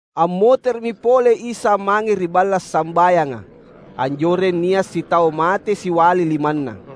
Ammotere’mi pole Isa mange ri balla’ sambayanga. Anjoreng nia’ sitau mate siali limanna.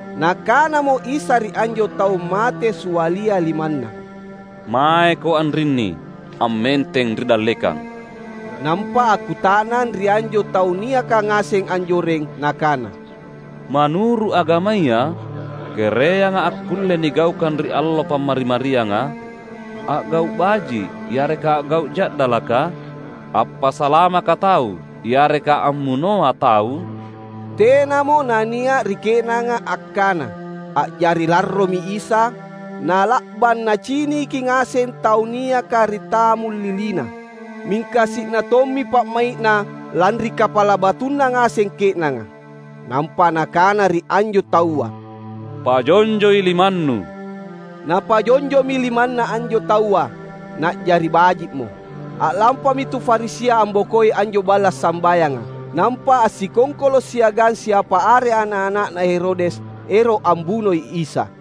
Nakanamo Isa ri anjo tau mate sialia limanna, "Maeko anrinni, ammenteng ri dallekang." Nampa akkuta’nang ri anjo tau niaka ngaseng anjoreng nakana, "Manuru’ agamaya, kereanga akkulle nigaukang ri allo Pammari-marianga? A’gau’ baji’ yareka a’gau’ ja’dalaka? Appasalamaka tau yareka ammunoa tau?" Tenamo na nia’ ri ke’nanga akkana. A’jari larromi Isa, na’la’bang Naciniki ngaseng tau niaka ri tammuliliNa. Mingka si’na tommi pa’mai’Na lanri kapala batuna ngaseng ke’nanga. Nampa Nakana ri anjo taua, "Pajonjoi limannu." Napajonjomi limanna anjo taua, na’jari baji’mo. A’lampami tu Farisia ambokoi anjo balla’ sambayanga. Nampa assikongkolo’ siagang siapa are ana’-ana’na Herodes, ero’ ambunoi Isa.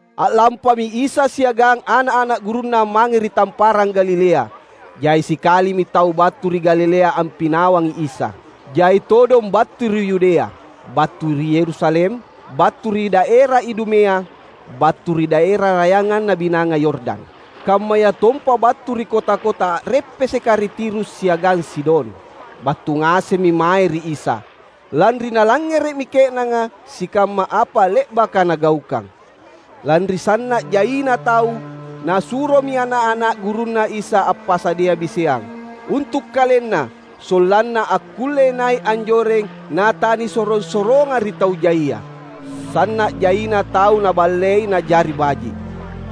A’lampami Isa siagang ana’-ana’ gurunNa mange ri Tamparang Galilea. Jai sikalimi tau battu ri Galilea ampinawangi Isa. Jai todong battu ri Yudea, battu ri Yerusalem, battu ri daera Idumea, battu ri daera rayanganna Binanga Yordan, kammayatompa battu ri kota-kota a’reppeseka ri Tirus siagang Sidon. Battu ngasemmi mae ri Isa, lanri nalangngere’mi ke’nanga sikamma apa le’baka Nagaukang. Lanri sanna’ jaina tau, Nasuromi ana’-ana’ gurunNa Isa appasadia biseang, untu’ KalenNa sollanna akkulle nai’ anjoreng na tanisorong-soronga ri tau jaia. Sanna’ jaina tau Naballei na’jari baji’.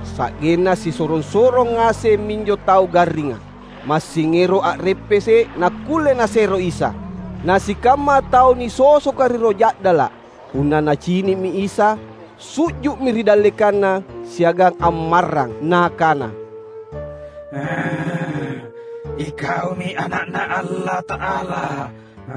Sa’genna sisorong-sorong ngaseng minjo tau garringa, massing ero’ a’reppese’ nakkulle nasero Isa. Na sikamma tau nisosoka ri roh ja’dala’, punna nacini’mi Isa, su’ju’mi ri dallekanNa siagang ammarrang nakana, "IKaumi Ana’Na Allata’ala."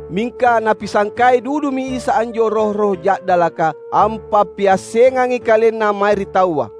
Mingka Napisangkai dudumi Isa anjo roh-roh ja’dalaka ampappiassengangi KalenNa mae ri taua.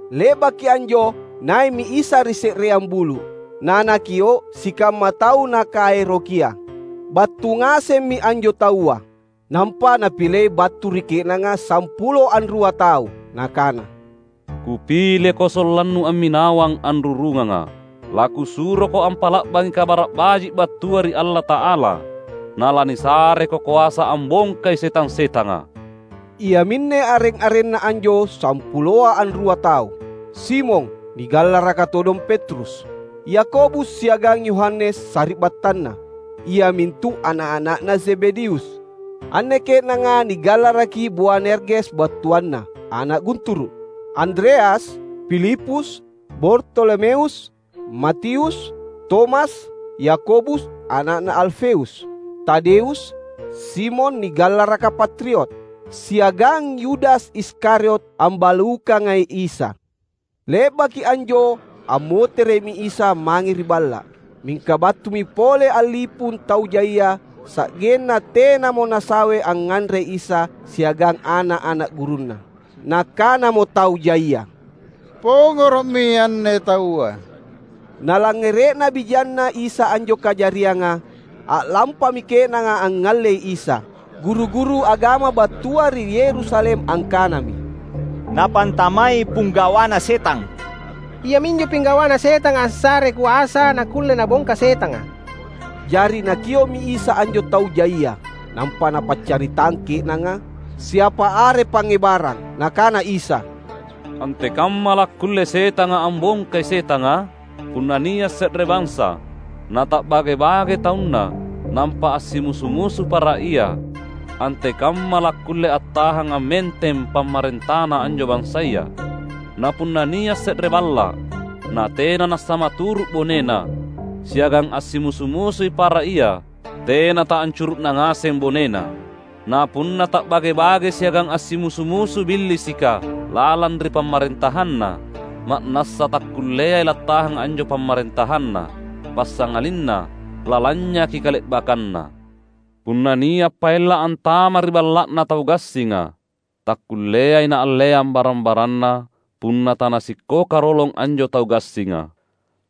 Le’baki anjo nai’mi Isa ri se’reang bulu’, na Nakio’ sikamma tau Nakaerokia. Battu ngasemmi anjo taua, nampa Napilei battu ri ke’nanga sampulo anrua tau. Nakana, "Kupileko sollannu amminawang anrurungangA’. LaKusuroko ampa’la’bangi Kabara’ Baji’ battua ri Allata’ala. Na lanisareko koasa ambongkai setang-setanga." Iaminne areng-arenna anjo sampuloa anrua tau: Simon (nigallaraka todong Petrus), Yakobus siagang Yohanes sari’battanna, iamintu ana’-ana’na Zebedeus (anne ke’nanga nigallaraki Boanerges battuanna "ana’ gunturu’"), Andreas, Filipus, Bartolomeus, Matius, Tomas, Yakobus ana’na Alfeus, Tadeus, Simon nigallaraka Patriot, siagang Yudas Iskariot ambalukangai Isa. Le’baki anjo ammotere’mi Isa mange ri balla’. Mingka battumi pole a’lipung tau jaia, sa’genna tenamo nasawe angnganre Isa siagang ana’-ana’ gurunNa. Nakanamo tau jaia, "Pongoro’mi anne taua!" Nalangngere’na bijanNa Isa anjo kajarianga, a’lampami ke’nanga angngallei Isa. Guru-guru agama battua ri Yerusalem angkanami, "Napantamai Pinggawana Setang! Iaminjo Pinggawana Setanga assarei koasa nakkulle Nabongka setanga." Jari Nakio’mi Isa anjo tau jaia, nampa Napaccaritang ke’nanga siapa are pangngebarang. Nakana Isa, "Antekamma lakkulle setanga ambongkai setanga? Punna nia’ se’re bansa, nata’bage-bage taunna nampa assimusu-musu para ia, antekamma lakkulle attahang ammenteng pamarentana anjo bansaya. Na punna nia’ se’re balla’, natena nassamaturu’ bonena, siagang assimusu-musui para ia, tena taancuru’na ngaseng bonena. Na punna ta’bage-bage siagang assimusu-musu Billisika lalang ri pamarentahanna, ma’nassa takkulleai lattahang anjo pamarentahanna, passangalinna lalanynyaki kale’bakkanna. Punna nia’ paella’ antama’ ri balla’na tau gassinga, takkulleai naalleang barang-baranna punna tanasikkoka rolong anjo tau gassinga.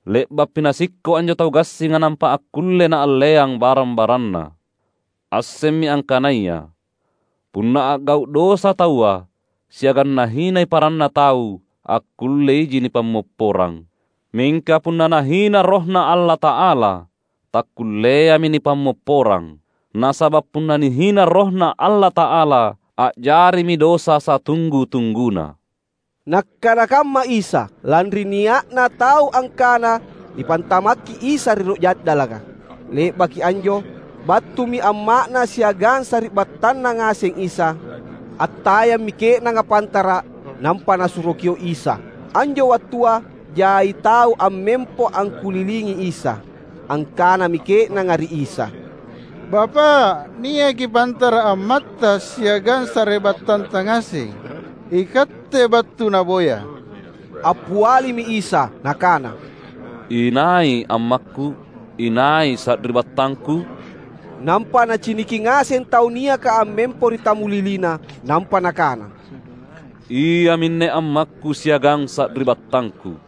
Le’bappi nasikko’ anjo tau gassinga nampa akkulle naalleang barang-baranna. Assemmi angkanaya, punna a’gau’ dosa taua, siagang nahinai paranna tau akkulle iji nipammopporang. Mingka punna nahina RohNa Allata’ala, takkulleami nipammopporang! Nasaba’ punna nihina RohNa Allata’ala, a’jarimi dosa satunggu-tungguna." (Nakkana kamma Isa, lanri nia’na tau angkananipantamakki Isa ri roh ja’dalaka.) Le’baki anjo battumi amma’Na siagang sari’battanNa ngaseng Isa. Attayammi ke’nanga pantara’, nampa nasuro kio’ Isa. Anjo wattua jai tau ammempo angkulilingi Isa. Angkanami ke’nanga ri Isa, "Bapa’, niaki pantara’ ammatTa siagang sari’battanTa ngaseng. IKatte battu naboya." Appialimi Isa Nakana, "Inai ammakKu? Inai sari’battangKu?" Nampa Naciniki ngaseng tau niaka ammempo ri tammuliliNa. Nampa Nakana, "Iaminne ammakKu siagang sari’battangKu!